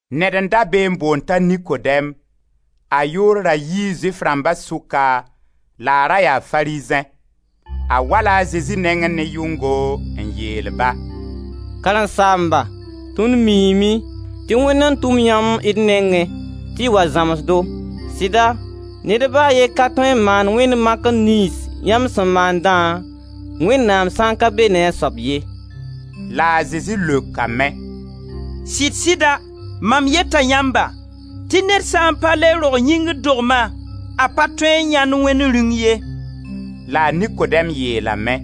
Ned n da be n boond t'a Nikodɛm; a yʋʋr ra yii Zʋɩf rãmba sʋka la a ra yaa Farizẽ. A wa-la a Zezi nengẽ ne yʋngo, n yeel-ba: «Karen-saamba, tõnd miime tɩ Wẽnd n tʋm yãmb d nengẽ tɩ y wa zãms-do. Sɩda ned ba a ye ka tõe n maan wẽnd makr niyns yãmb sẽn maandã, Wẽnnaam sã n ka be ne a soab ye.» La a Zezi leokame: «Sɩd-sɩda, mam yeta yãmba tɩ ned sã n pa le rog yĩngr dogma, a pa tõe n yãend Wẽnd Rĩung ye.» La a Nikodɛm yeelame: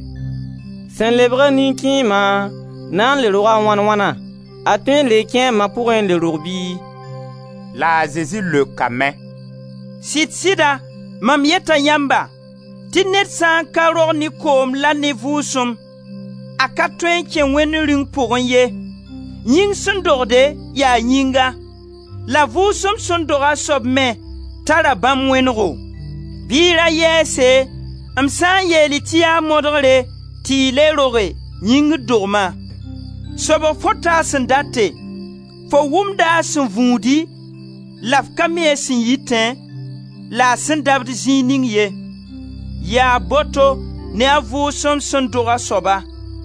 «Sẽn lebga nin-kẽema na n le roga wãn wãna? A tõe n le kẽe a ma pʋgẽ n le rog bɩ?» La a Zezi leokame: «Sɩd-sɩda, mam yeta yãmba, tɩ ned sã n ka rog ne koom la ne Vʋʋsem, a ka tõe n kẽ Wẽnd Rĩung pʋgẽ ye. Yĩng sẽn dogde, yaa yĩnga, la Vʋʋsem sẽn dog a soab me tara bãmb wẽnego. Bɩ y ra yɛɛse, m sã n yeel-y tɩ yaa modgre tɩ y le roge, yĩngr dogma. Sobg fõta a sẽn date, fo wʋmda a sẽn vũudi la f ka mi a sẽn yitẽ la a sẽn dabd zĩig ning ye. Yaa boto ne a Vʋʋsem sẽn dog a soaba.»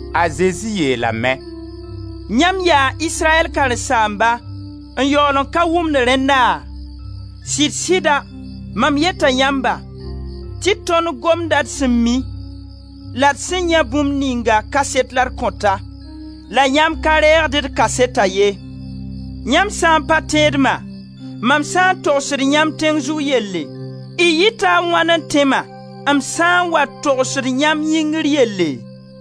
A Zezi yeelame: «Yãmb yaa Israyɛl karen-saamba, n yaool n ka wʋmd rẽnna? Sɩd-sɩda, mam yeta yãmba, tɩ tõnd gomda d sẽn mi, la d sẽn yãe bũmb ningã kaset la d kõta. La yãmb ka reegd d kaseta ye. Yãmb sã n pa tẽed-ma, mam sã n togsd yãmb tẽng zug yelle, y yɩta a wãn n tẽ-ma, m sã n wa togsd yãmb yĩngr yelle?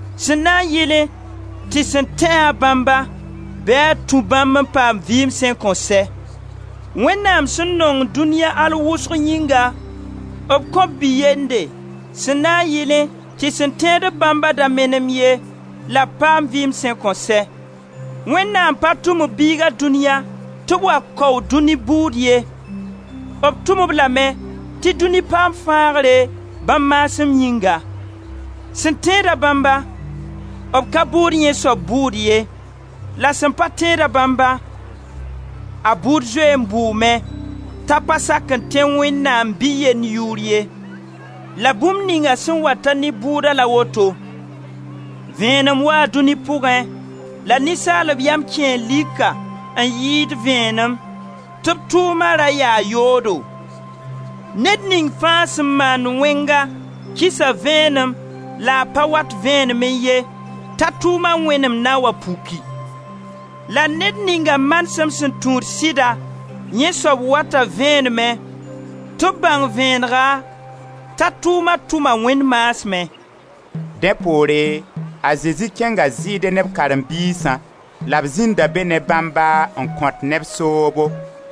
sẽn na yɩlẽ tɩ sẽn tẽ-a bãmba, bɩ a tũ bãmb n paam vɩɩm sẽn kõn sɛ. Wẽnnaam sẽn nong dũniya al wʋsg yĩnga, b kõ b Bi-yende, sẽn na n yɩlẽ tɩ sẽn tẽed-b bãmba da menem ye, la b paam vɩɩm sẽn kõn sɛ. Wẽnnaam pa tʋm b Biiga dũniya tɩ b wa kao dũi bʋʋd ye, b tʋm-b lame tɩ dũni paam fãagre, bãmb maasem yĩnga. Sẽn tẽed-a bãmba, b ka bʋʋd yẽ soab bʋʋd ye; la sẽn pa tẽed-a bãmba, a bʋʋd zoe n bʋʋme, t'a pa sak n tẽ Wẽnnaam Bi-yend yʋʋr ye. La bũmb ninga sẽn wata ne bʋʋda la woto: Vẽenem waa dũni pʋgẽ, la ninsaalb yam kẽe lika n yɩɩd vẽenem tɩ b tʋʋma ra yaa yoodo. Ned ning fãa sẽn maand wẽnga, kisa vẽenem la a pa wat vẽenemẽ ye t'a tʋʋma wẽnem na n wa puki. La ned ninga manesem sẽn tũud sɩda, yẽ soab wata vẽenemẽ, tɩ b bãng vẽenega, t'a tʋʋma tʋma Wẽnd maasmẽ.» Dẽ poore a Zezi kẽnga Zɩɩde ne b karen-biisã la b zĩnda be ne bãmba n kõt neb soobo.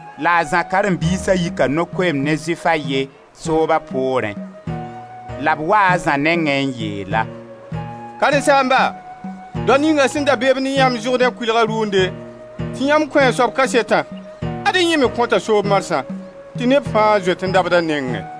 La a Zã karen-biisa yika no-koeemd ne Zʋɩf a ye, sooba poorẽ. La b wa a Zã nengẽ n yeel-a: «Karen-saamba, dao ninga sẽn da be-b ne yãmb Zʋrdẽ kʋɩlg rʋʋnde tɩ yãmb kõ a soab kasetã, ad-y yẽ me kõta soob marsã tɩ neb fãa zoet n dabd a nengẽ.»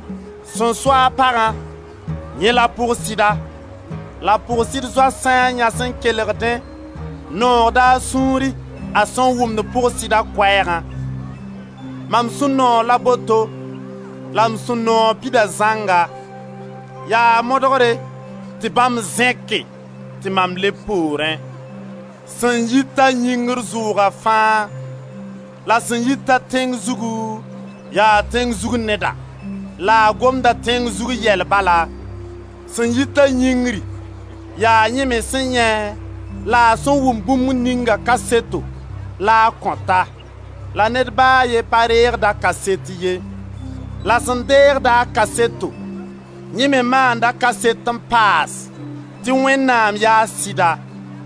Sẽn so-a pagã, yẽ la pʋg-sɩda; la pʋg-sɩd zoa sã n yɛs n kelgdẽ, noogda a sũuri a sẽn wʋmd pʋg-sɩda koɛɛgã. Mam sũ-noog la boto, la m sũ-noog pida zãnga. Yaa modgre tɩ bãmb zẽke tɩ mam leb poorẽ. Sẽn yit-a yĩngri zʋʋga fãa; la sẽn yit-a tẽng zugu yaa tẽng zug neda, la a gomda tẽng zug yɛl bala. Sẽn yit-a yĩngri, yaa yẽ me sẽn yãe la a sẽn wʋm bũmb ninga kaseto la a kõta, la ned ba a ye pa reegd a kaset ye. La sẽn deegd-a kaseto, yẽ me maanda kaset n paas tɩ Wẽnnaam yaa sɩda.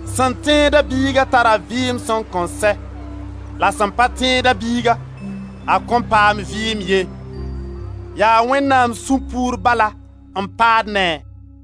Sẽn tẽed-a Biiga tara vɩɩm sẽn kõn sɛ, la sẽn pa tẽed-a Biiga, a kõn paam vɩɩm ye, yaa Wẽnnaam sũ-puur bala n paad ne-a.»